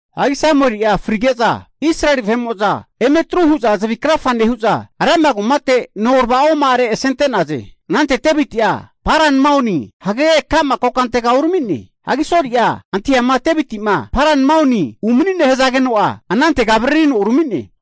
Hagi Samueli'a frige'za Israeli vahe'mo'za eme atru hu'za zavi krafa nehu'za Rama kumate norava'oma'are asente'naze. Anante Deviti'a Paran Maoni hagege ka'ma kokantega urami'ne. Hagi Soli'a antahiama Deviti'ma Paran Maoni umani'ne hazageno'a anantega avaririno urami'ne.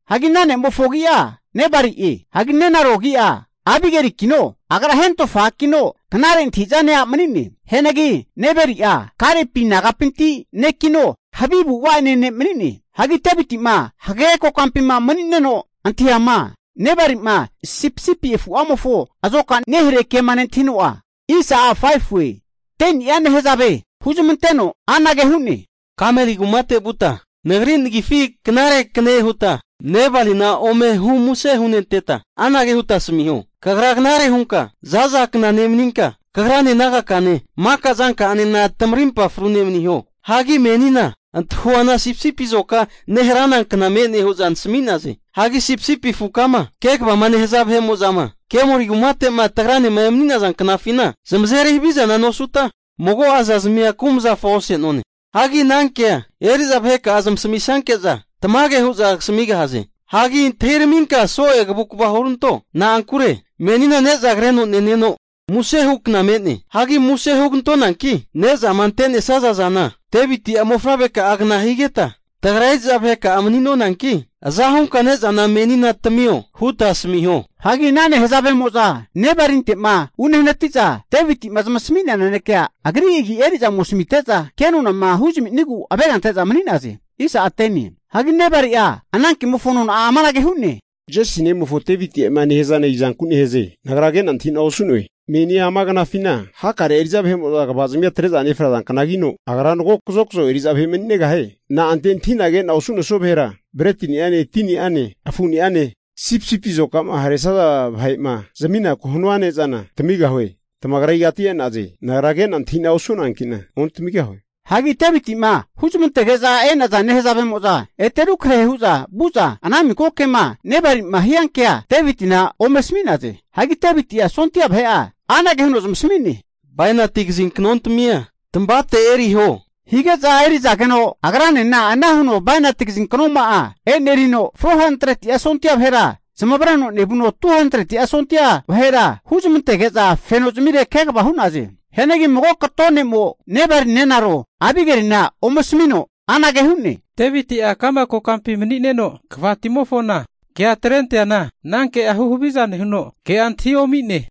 Hagi ana ne'mofo agi'a Nebali'e. Hagi nenaro agi'a Abigelikino, agra hentofa a'kino knare antahi'zane a' mani'ne. Hianagi Nebali'a Kalepi nagapinti ne'kino, havi avu'ava ene' ne' mani'ne. Hagi Deviti'ma hagege kokampima mani'neno antahiama, Nebali'ma sipisipi afu'amofo azoka nehare kema nentahino'a, 10ni'a nehazave huzamanteno anage hu'ne, Kameli kumate vuta, nagri nagifi knare kne huta Nebalina ome humuse hunenteta, anage huta asamiho, Kagra knare hunka za'za kna nemaninka, kagrane nagakane maka zanka'anena tamarimpa frune maniho, Hagi menina antahuana sipisipi azoka neharana kna me'ne hu'za nasami'naze. Hagi sipisipi afukama kegavama nehaza vahe'mo'zama Kemoli kumate'ma tagranema emani'naza knafina, zamazeri havizana nosuta, mago'a zazmia kumazafa ose'none. Hagi anankea eri'za vaheka'a zamasamisanke'za, tamage hu'za kasamigahaze. Hagi antahiraminka so'e kavukva huranto. Na'ankure menina ne'za kreno neneno muse hukna me'ne. Hagi muse hugantonanki, ne'zama ante'nesaza zana Deviti'a mofavreka'agna higeta tagra eri'za vaheka'a mani'nonanki aza hunka ne'zana menina tamio huta asmiho. Hagi ana nehazavemo'za Nebalinte'ma unehanati'za Deviti'ma zamasami'nea nanekea agri agi eri'za ome asamite'za, kenonama huzaminigu avega ante'za mani'naze. Hianagi Nebali'a ana kemofo nona'a amanage hu'ne, Jesi ne'mofo Deviti'ema nehazana izanku nehaze. Nagra ke'na antahi'na osu'noe? Meni ama knafina hakare'a eri'za vahe'mo'za kva'zimia atre'za nefraza knagino, agra mago kazokzo eri'za vahe mani'negahie. Na'ante antahi'na ke'na osu'nesoa vahera, bretiniane, tini'ane, afu'niane sipisipi azoka'ma haresaza vahe'ma zaminaku'ma hanua ne'zana tamigahue? Tamagra igati e'naze nagra kena antahina osu'noanki'na ontamigahue. Hagi Devitima huzmantege'za e'naza nehazavemo'za ete rekrahe hu'za vu'za ana miko kema Nebali'ma hiankea Devitina ome asami'naze. Hagi Deviti'a sondia vahe'a anage huno zamasami'ne, Bainati kazinknontamia tamavate eriho hige'za eri'zageno, agranena ana huno bainati kazinknoma'a e'nerino, 400'a sondia vahera zamavareno nevuno, 200'a sondia vahera huzmantege'za fenozamire kegava hu'naze. Hianagi mago kato ne'mo Nebali nenaro Abigelina ome asamino anage hu'ne, Deviti'a ka'ma kokampi mani'neno, kvatimofona kea atrenteana ana kea huhaviza nehuno, ke'a antahi omi'ne.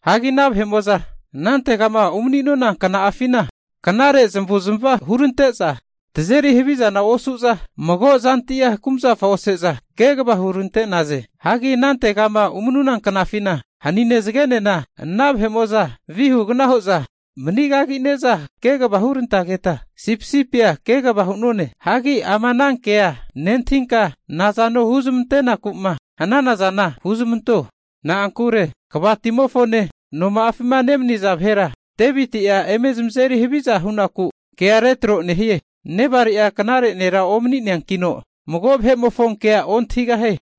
Hagi ana vahe'mo'za anantegama umanuna kna'afina knare zamavuzmava hurante'za, tazeri havizana osu'za, mago zantia kumazafa ose'za kegava hurante'naze. Hagi anantegama umanuna knafina hanine zagenena ana vahe'mo'za vihugna hu'za manigagine'za kegava hunerantageta sipisipia kegava hu'none. Hagi ama anankea nentahinka, nazano huzmantenaku'ma hanana zana huzamanto. Na'ankure kvatimofone noma'afima nemaniza vahera Deviti'a eme zamazeri haviza hu'naku kea retro nehie. Nebalia knare nera omani'neankino, mago vahe'mofo kea ontahigahie.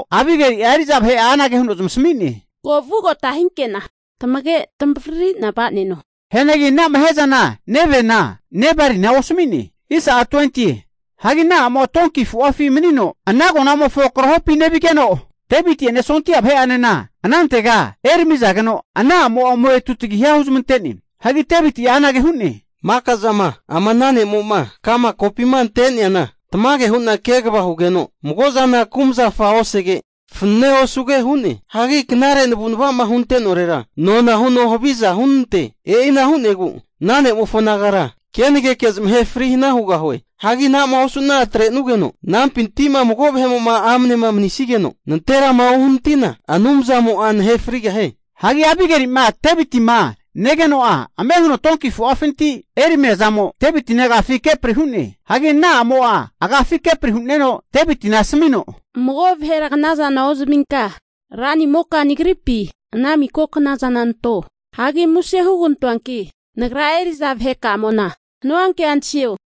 Hagi Abigeli'a eri'za vahe'a anage huno zamasmi'ne, Ko vugota hinke'na tamage tamavaririna va'neno. Hianagi ana'ma hiazana nevena Nebalina osami'ne. Hagi ana a'mo'a donki afu'afi manino ana agonamofo krahopi nevigeno, Deviti'ene sondia vahe'anena anantega eramigeno, ana a'mo'a ome tutagiha huzmante'ne. Hagi Deviti'a anage hu'ne, Maka'zama ama ana ne'mo'ma ka'ma kopima ante'neana tamage hu'na kegava hugeno mago'zana kumazufa osege, fanenea osuge hu'ne. Hagi knare navu'nava'ma hunte'norera nona huno haviza hunante'ne. E'ina hu'negu ana ne'mofo nagara kenageke zamahe fri hana hugahue. Hagi ana'ma osu'na atrenugeno anampinti mago vahe'mo'ma amnema mani'nesigeno nanterama uhanatina, Anumzamo'a nahe frigahie. Hagi Abigeli'ma Devitima negeno'a ame huno donki afu'afinti eramia zamo, Devitina agafi kepri hu'ne. Hagi ana a'mo'a agafi kepri huneno Devitina asamino, Mago vahera knazana ozaminka, ranimoka nagripi ana miko knazana anto. Hagi muse hugantoanki nagra eri'za vahekamo'nama hanua kea antahio.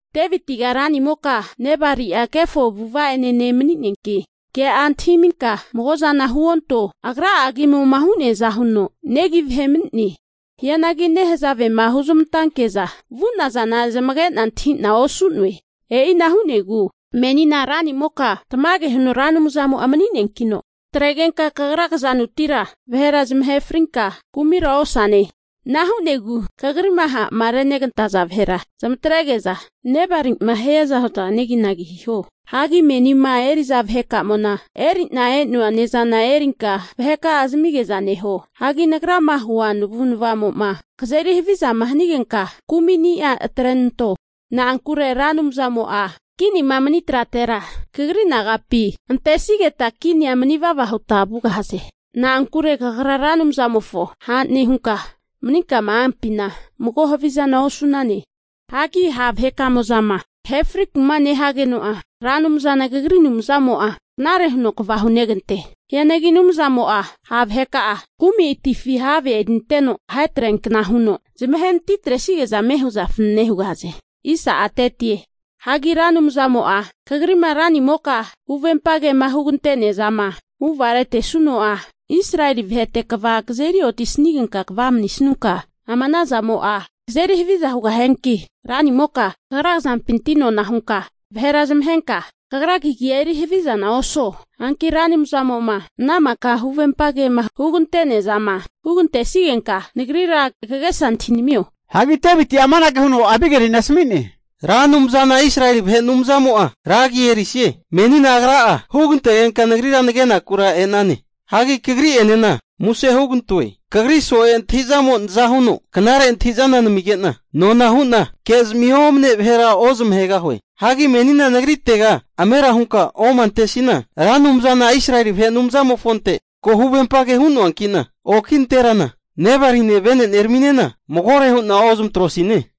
Devitiga ranimoka Nebali'a kefo avu'ava'ene ne' mani'neanki ke'a antahiminka mago'zana huonto. Agra'a agimo'ma hu'neaza huno negi vahe mani'ne. Hianagi nehazavema huzmantanke'za vu'nazana zamage'na antahina osu'noe. E'ina hu'negu menina ranimoka tamage huno Ra Anumzamo'a mani'neankino, kataregenka kagra kazanutira vahera zamahe frinka kumira osane. Ana hu'negu kagri'ma ha'ma regantesaza vahera zamatrege'za Nebali'ma hiaza hu'za neginagi hiho. Hagi menima eri'za vahekamo'na eri'na e'noa ne'zana erinka, vaheka'a zamige'za neho. Hagi nagrama hua navu'navamo'ma kazeri havizama hanigenka, kumi'ni'a atrenanto. Na'ankure Ra Anumzamo'a kinima mani trara kagri nagapi antesigeta kinia manivava huta vugahaze. Na'ankure kagra Ra Anumzamofo ha' nehunka, maninkama ampina, mago havizana osu'nane. Hagi ha' vahekamo'zama kahe friku'ma nehageno'a, Ra Anumzana kagri Anumzamo'a knare huno kva hunegante. Hianagi Anumzamo'a ha' vaheka'a kumi atifi have erinteno ahetreankna huno zamahenati atresige'za ame hu'za fanane hugahaze. Hagi Ra Anumzamo'a kagrima ranimoka huvempagema hugante'neazama huvamaretesuno'a, Israeli vahete kva kazeri otisanigenka kva manisanunka, ama anazamo'a kazeri haviza hugahianki, ranimoka kagra kazampintira nona hunka vahera zamahenka kagra kagia eri havizana osuo. Hanki Ra Anumzamo'ma ana mika'ma huvempage hugante'nea zama hugantesigenka, nagrira kagesa antahinamio. Hagi Deviti'a amanage huno Abigelina asmi'ne, Ra Anumzana Israeli vahe Anumzamo'a ra agi erisie! Menina Agra'a hugantegenka nagrira nagekura e'nane. Hagi kagri'enena muse hugantoe, kagri so'e antahi'zamo naza huno knare antahi'zana namige'na, nona hu'na kezmi omane vahera ozamahegahue. Hagi menina nagritega amera hunka omantesina, Ra Anumzana Israeli vahe Anumzamofonte ko huvempage hu'noanki'na, oki nanterana Nebali'ene veneneraminena magore hu'na ozamatrosine.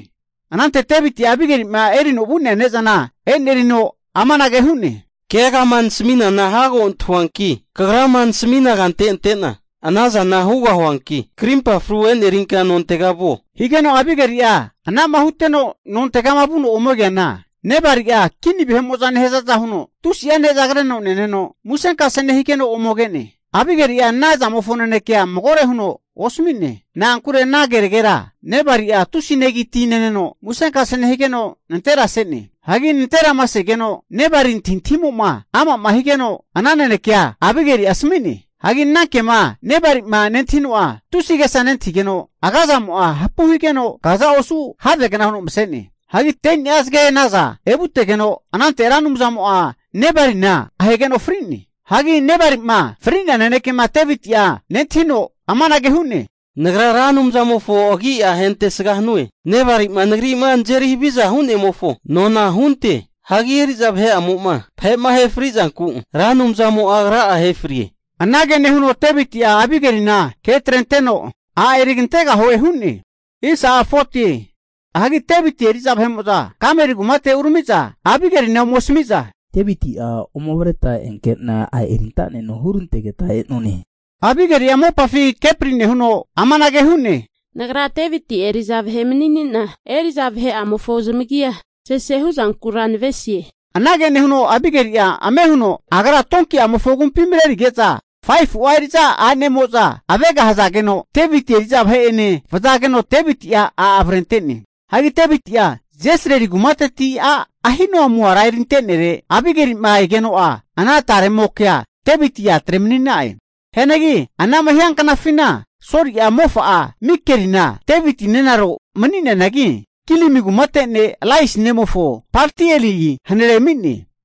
Anante Deviti'a, Abigeli'ma erino vu'nea ne'zana e'nerino amanage hu'ne, Keagama nasami'nana hago antahoanki, kagrama nasamina kante ante'na anazana hugahuanki, krimpa fru e'nerinka nontega vuo. Higeno Abigeli'a anama huteno nontegama vuno ome keana, Nebali'a kini vahe'mo'za nehazaza huno tusi'a ne'za kreno neneno musenkase nehigeno ome ke'ne. Abigeli'a ana zamofo nanekea magore huno osami'ne. Na'ankure ana keragera Nebali'a tusi'a negi ti neno musenkase nehigeno nanterase'ne. Hagi nanterama segeno Nebali antahintahimo'ma ama'ma higeno, ana nanekea Abigeli'a asami'ne. Hagi anankema Nebali'ma nentahino'a tusi agesa nentahigeno, agazamo'a hapu higeno kaza osu havegna huno mase'ne. Hagi 10ni'a zagegna naza evutegeno, anante Ra Anumzamo'a Nebalina ahegeno fri'ne. Hagi Nebali'ma fri'nea nanekema Deviti'a nentahino amanage hu'ne, Nagra Ra Anumzamofo agi'a hentesga hanue, Nebali'ma nagri'ma nazeri haviza hu'nemofo nona hunte. Hagi eri'za vahe'amo'ma vahe'ma ahe frizanku Ra Anumzamo'a Agra'a ahe frie. Anage nehuno Deviti'a Abigelina ke atrenteno, a' erigantegahue hu'ne. Hagi Deviti eri'za vahe'mo'za Kameli kumate urami'za Abigelina ome asami'za, Deviti'a ome avreta enkena a' erintaneno huno hurantegeta e'none. Abigeli'a mopafi kepri nehuno amanage hu'ne, Nagra Deviti' eri'za vahe mani'ne'na eri'za vahe'amofo zamagia sese hu'zankura nave'nesie. Anage nehuno Abigeli'a ame huno agra donki'amofo agumpi marerige'za 5fu'a eri'za a'ne'amo'za avega hazageno, Deviti eri'za vahe'ene vazageno, Deviti'a a' avrente'ne. Hagi Deviti'a Jezriri kumateti a' Ahinoamu ara erinte'nere, Abigeli'ma egeno'a ana taregamokea Deviti atre mani'na'e. Hianagi anama hianknafina Soli'a mofa'a Mikelina Deviti nenaro mani'neanagi, Gilim kumate ne' Lais nemofo Paltieli hanare ami'ne.